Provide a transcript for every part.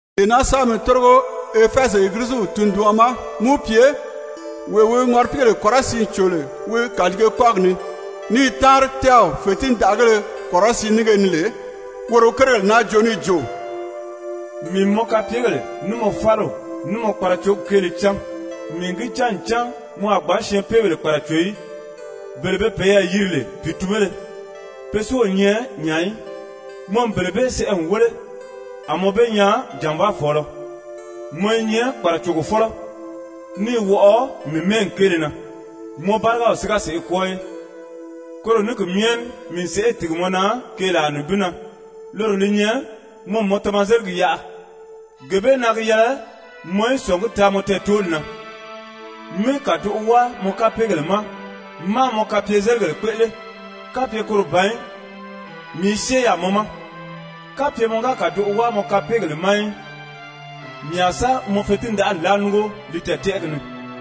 «Dee naa sɛ́bɛ mi tórigo Efɛzi Egiliziw tunduɔn ma, mí wi pye: ‹Wee wi ŋɔripiigèle kɔrɔsiin cò lè wi kàliige kɔ́gi ni, ní i táanri tɛ́ɛw fètindaʔagéle kɔrɔsiin nínge ni lè, woro wi kérigèle naa joo níì jo: Mii n mɔ kapyegèle, ní mɔ fáliw, ní mɔ kparacogi kéele cán. Mii n gi cán ncan mɔ a gbǎn syɛɛnpeebèle kpàraco í. Bele be peyɛɛ yiri lè pìitunbéle, pe si o nyɛ nya í, mɔ n bele bee sɛʔɛ n wéle, a mɔ be nyaa jànvaafɔɔlɔ. Mɔ i nyɛ kpàracogofɔlɔ, ní i wɔʔɔ mii mɛ́ɛgi kéele na, mɔ bárigaw si ga sèʔê kwɔ́ɔ í. Koro ní ki myɛ ní mii n sèʔê tìgi mɔ na keelaa nibin na, loro li nyɛ mɔ n mɔ tamazeligi yaʔa. Gee bee na gi yɛlɛ mɔ í sɔ̀ngí taa mɔ tɛɛtooli na, mí kàdoʔo wáa mɔ kapeegèle ma máā mɔ kapyezeligèle kpéʔele, kapye koro ban í mii i syée yaà mɔ ma, kapye mɔ ga kàdoʔo wáa mɔ kapeegèle ma í, mii a sa mɔ fetindaʔali láa núngo li tɛɛ̀tɛʔɛgi ni.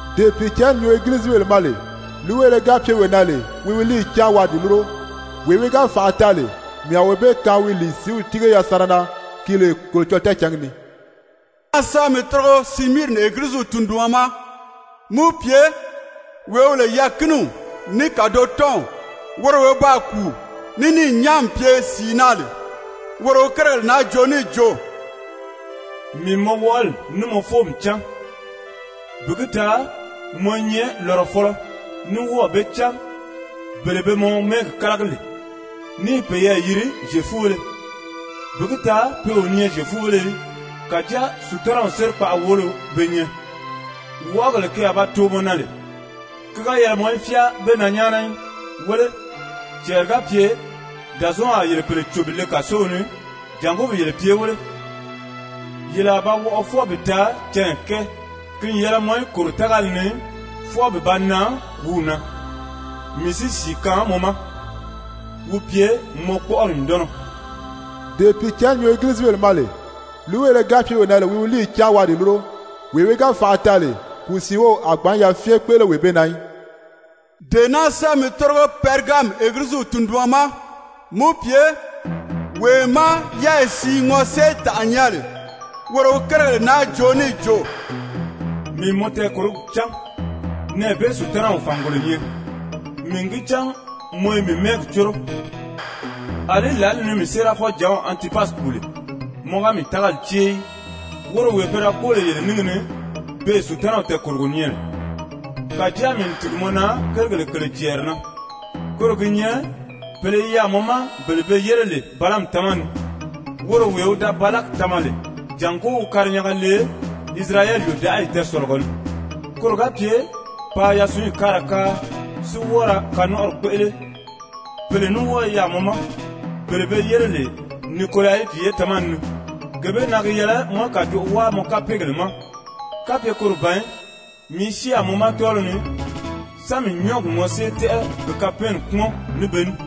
Dee Pìicǎnni nyuu Egilizibèle ma lè, líiweele ga pye wee na lè, wi líiyi cáan waa di lúro, Wee wi ga fànʔa taa lè, mii a wee bee kaan wi lìi sìíw tíige yasanra na ki lè Kolocɔlɔɔ tɛɛcǎngi ni.› «Dee naa sɛ́bɛ mi tórigo Simiirini Egiliziw tunduɔn ma, mí wi pye: ‹Wee wi lè yɛɛ̀kiniw ní kàdotɔnw, woro wee wi baa kùu ní níì nyán n pye sìi na lè, woro wi kérigèle naa joo níì jo: Mii n mɔ wɔʔɔli ní mɔ fóomi cán, bi gi taa mɔ i nyɛ lɔrɔfɔlɔ, ní wɔ́ɔ̀ be cán bele be mɔ mɛ́ɛgi kálagi lè, ní i peyɛɛ yiri Zyefubéle, bi gi taa pe o nyɛ Zyefubéle í, kàjáa Sutanaw sérikpaʔa woolo be nyɛ. Wɔʔɔgèle ke a ba too mɔ na lè, ki ga yɛlɛ mɔ í fyáa ge na nyáana í. Wéle, cɛɛri ga pye Dàzɔɔnw a yele pèle cò bi le kàsow ni jàngó bi yele pye wéle, yele a ba wɔʔɔ fwɔɔ bi taa canya kɛɛ. Ki n yɛlɛ mɔ í kòro tágali ni fwɔɔ bi ba nan kùúw na, mii si sìi kaan mɔ ma, wi pye mɔ kpɔ́ʔɔri nyùndɔnnɔ. Dee Pìicǎnni nyuu Egilizibèle ma lè, líiweele ga pye wee na lè, wi líiyi cáan waa di lúro! Wee wi ga fànʔa taa lè, kùu siin wów a ní gbǎn yafyɛn kpéʔele wee bee na í.› «Dee naa sɛ́bɛ mi tórigo Pɛrigami Egiliziw tunduɔn ma, mí wi pye: ‹Wee má yɛ́ɛyi siin ŋɔséetànʔa nyɛ lè, woro wi kérigèle naa joo níì jo: Mii n mɔ tɛɛkòrogi cán, nɛɛ bee Sutanaw fàngolo nyɛ. Mii n gi cán mɔ i mii mɛ́ɛgi córo, àlí lǎli ni mii séerafɔjǎnw Antipasi kùu lè, mɔ ga mii tágali cée í, woro wee pe da kpóo lè yele níngi ni, beè Sutanaw tɛɛkòrogo nyɛ lè. Kàjáa mii n tìgi mɔ na kérigèle kèle cɛɛri na, koro gi nyɛ pèle i yaà mɔ ma bele be yére lè Balaami tamani ni, woro wee wi da Balaki tama lè jàngó wi karinyanga le Isirayɛli yòdaʔayi tɛɛsɔ̀lɔgɔ ni, koro ga pye paa yasunyi káara káa, si wɔ́ɔ ra kanɔnʔɔri kpéʔele. Pèle ní wɔ́ɔ i yaà mɔ ma, bele be yére lè Nikolayiti ye tamani ni. Gee bee na gi yɛlɛ mɔ í kàdoʔo wáa mɔ kapeegèle ma, kapye koro ban í, mii i syée yaà mɔ ma tɔ́ɔliw ni sa mii nyɔ́ɔgi ŋɔsée tɛ́ʔɛ bi kapɛɛnni kpúmɔn ní be ní.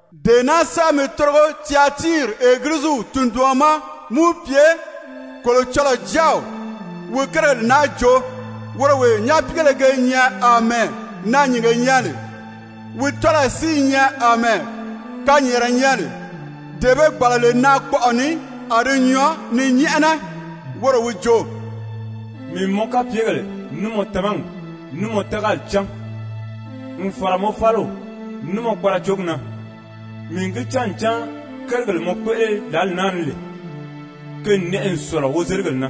«Dee naa sɛ́bɛ mi tórigo Tyatiiri Egiliziw tunduɔn ma, mí wi pye: ‹Kolocɔlɔɔ Jáaw wi kérigèle naa joo, woro wee nyapiigéle ge nyɛ àmɛɛ naanyìnge nyɛ lè, wi tɔ́lɔyi si i nyɛ àmɛɛ kanyɛɛnrɛ nyɛ lè, dee be gbàla lè naakpɔʔɔ ni a di nyɔɔ ni nyɛ́ʔɛnɛ, woro wi jo: Mii n mɔ kapyegèle, ní mɔ tamagi, ní mɔ tágali cán, n fàra mɔ fáliw, ní mɔ kparacogi na, mii n gi cán ncan kérigèle mɔ kpéʔele lǎli naa ni lè, ke n nɛʔɛ n sɔ̀lɔ wozeligèle na.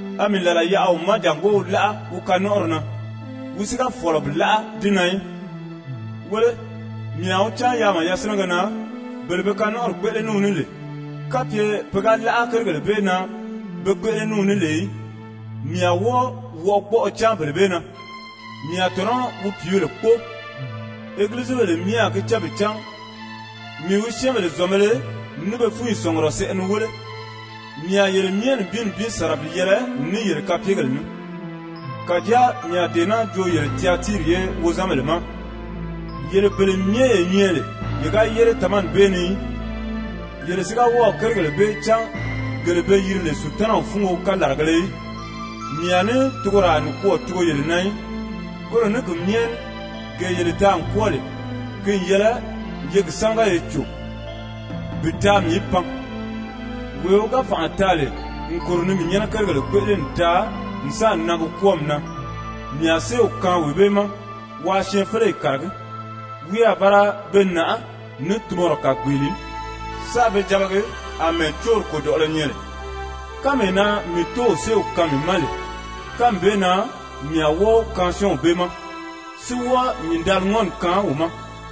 A mii làla yaʔa wi ma jàngó wi láʔa wi kanɔnʔɔri na, wi si ga fɔ̀lɔ bi láʔa di na í. Wéle, mii a wi cáan yaama yasinɛgɛ na, bele be kanɔnʔɔri kpéʔele ní wi ní lè, kapye pe ga láʔa kérigèle bee na be kpéʔele ní wi ní lè í, mii a wɔ́ɔ wɔʔɔgbɔɔlɔ cáan bele bee na. Mii a tɔ̀nɔ́ wi pìíbèle kpóo. Egilizibèle myɛ a gi cán bi cán mii wi syɛ́ɛnbèle zɔ̀nbēle ní be fúnyi sɔ̀ngurɔ sɛʔɛ ni wéle, mii a yele myɛ nibin nibin sàra bi yɛlɛ ní yele kapyegèle ní. Kàjáa mii a dee naa joo yele Tyatiiri ye wozanbèle ma yele bele myɛ ye nyɛ lè ye ga yére tamani bee ni í, yele si ga wɔ́ɔ̀ kérigèle bee cán gele be yiri lè Sutanaw fúngo kalaragēle í, mii a ní tugoraa nikwɔɔ tugo yele na í. Koro ní ki myɛ ní gee yele taa n kwɔ́ɔ lè, ki n yɛlɛ ye gi sámaga ye cò bi taa mii í pan. Wee wi ga fànʔa taa lè n kòro ni mii nyɛ́nɛ kérigèle kpéʔele n taa n sáà nan gi kwɔ́ɔmi na, mii a séew kaan wee bee ma waa syɛɛnfeleyi kàragí. Wi a ba ra be nàʔá ní tunmɔrɔ kàgbeele ní, sáā be jabagi àmɛɛ cóori kòdɔʔɔlɔ nyɛ lè, kánmee na mii Tóow séew kaan mii ma lè, kánmi bee na mii a wɔ́ɔ wi kaan syɔ́ɔnw bee ma, si wɔ́ɔ nyìndaliŋɔni kaan wi ma.